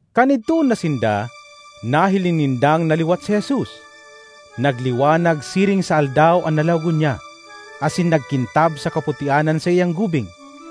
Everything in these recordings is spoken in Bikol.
Kan idtoon na sinda, nahiling nindang naliwat si Jesus; nagliwanag siring sa aldaw an lalawogon niya, asin nagkintab sa kaputian an saiyang gubing.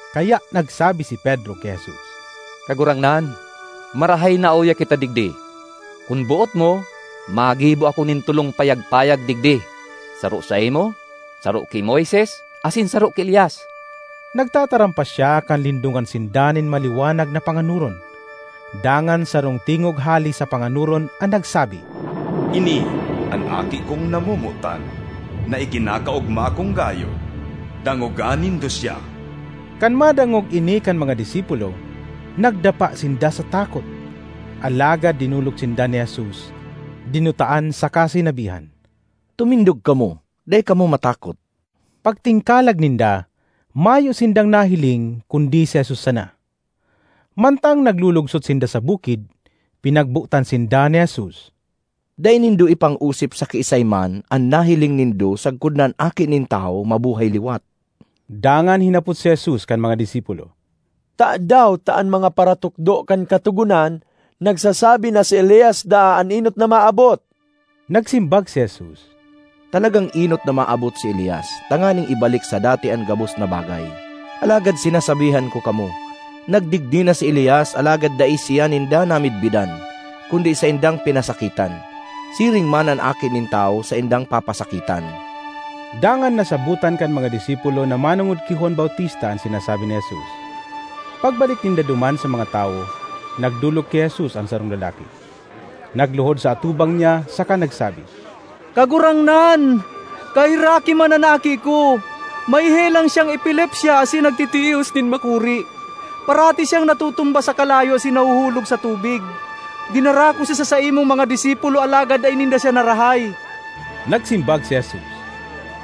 Kaya nagsabi si Pedro ki Jesus, “Kagurangnan, marahay na uya kita digdi. Kun boot mo, magibo ako nin tolong payag-payag digdi, saro saimo, saro ki Moises asin saro ki Elias.” Nagtataram pa siya kan lindongan sinda nin maliwanag na panganoron. Dangan sarong tingog hale sa panganoron an nagsabi, “Ini an Aki kong namomotan na ikinakaogma kong gayo—dangoga nindo siya!” Kan madangog ini kan mga disipulo, nagdapa sinda sa takot. Alagad dinolok sinda ni Jesus, dinutaan saka sinabihan, “Tumindog kamo! Dai kamo matakot!” Pagtingkalag ninda, mayo sindang nahiling kundi si Jesus sana. Mantang naglulugsot sinda sa bukid, pinagbotan sinda ni Jesus, “Dai nindo ipang-osip sa kiisay man an nahiling nindo sagkod na an Aki nin Tawo mabuhay liwat.” Dangan hinapot si Jesus kan mga disipulo, “Tadaw ta an mga paratukdo kan Katogonan nagsasabi na si Elias daa an enot na maabot?” Nagsimbag si Jesus, “Talagang enot na maabot si Elias tanganing ibalik sa dati an gabos na bagay. Alagad sinasabihan ko kamo, nagdigdi na si Elias alagad dai siya ninda namidbidan, kundi saindang pinasakitan. Siring man an Aki nin Tawo saindang papasakitan.” Dangan nasabotan kan mga disipulo na manongod ki Juan Bautista an sinasabi ni Jesus. Pagbalik ninda duman sa mga tawo, nagdolok ki Jesus an sarong lalaki, nagluhod sa atubang niya saka nagsabi, ”Kagurangnan, kaheraki man an aki ko! May helang siyang epilepsya asin nagtitios nin makuri. Parati siyang natutumba sa kalayo asin nahuhulog sa tubig. Dinara ko siya sa saimong mga disipulo alagad dai ninda siya narahay.” Nagsimbag si Jesus,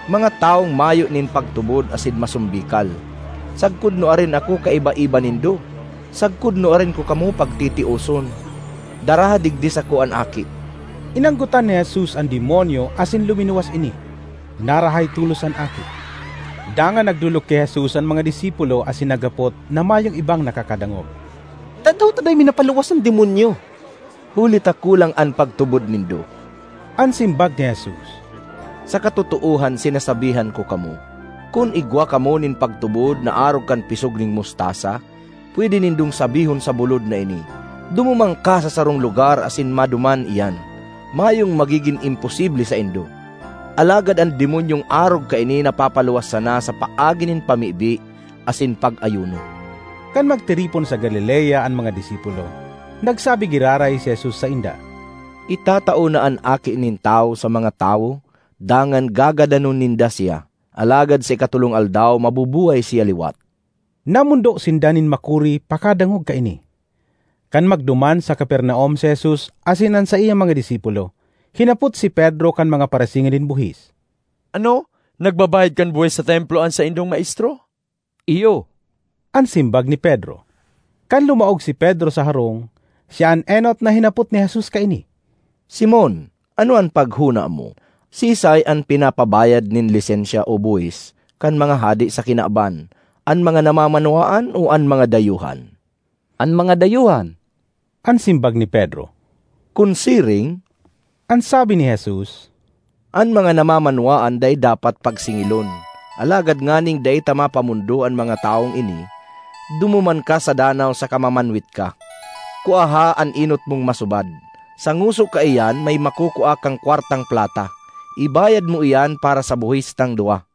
“Mga tawong mayo nin pagtubod asin masombikal! Sagkod nuarin ako kaibaiba nindo? Sagkod nuarin ko kamo pagtitioson? Daraha digdi sako an aki!” Inanggotan ni Jesus an demonyo asin luminuwas ini; narahay tolos an aki. Dangan nagdolok ki Jesus an mga disipulo asin naghapot na mayong ibang nakakadangog, “Tadaw ta dai mi napaluwas an demonyo?” ”Huli ta kulang an pagtubod nindo,” an simbag ni Jesus. “Sa katotoohan sinasabihan ko kamo, kun igwa kamo nin pagtubod na arog kan pisog nin mustasa, pwede nindong sabihon sa bulod na ini, ‘Dumuman ka sa sarong lugar’, asin maduman iyan! Mayong magigin imposible saindo. (Alagad an demonyong arog kaini napapaluwas sana sa paagi nin pamibi asin pag-ayuno.)” Kan magtiripon sa Galilea an mga disipulo, nagsabi giraray si Jesus sainda, “Itatao na an Aki nin Tawo sa mga tawo dangan gagadanon ninda siya; alagad sa ikatolong aldaw mabubuhay siya liwat.” Namondo sinda nin makuri pakadangog kaini. Kan magduman sa Capernaum si Jesus asin an saiyang mga disipulo, hinapot si Pedro kan mga parasingil nin buhis, “Ano, nagbabayad kan buhis sa Templo an saindong maestro?” ”Iyo,” an simbag ni Pedro. Kan lumaog si Pedro sa harong, siya an enot na hinapot ni Jesus kaini, “Simon, ano an paghona mo? Siisay an pinapabayad nin lisensya o buhis kan mga hade sa kinaban, an mga namamanwaan o an mga dayuhan?” ”An mga dayuhan,” an simbag ni Pedro. “Kun siring,” an sabi ni Jesus, “an mga namamanwaan dai dapat pagsingilon. Alagad nganing dai ta mapamondo an mga tawong ini, dumuman ka sa danaw saka mamanwit ka. Kuaha an enot mong masubad; sa ngoso kaiyan may makukua kang kwartang plata. Ibayad mo iyan para sa buhis tang duwa.”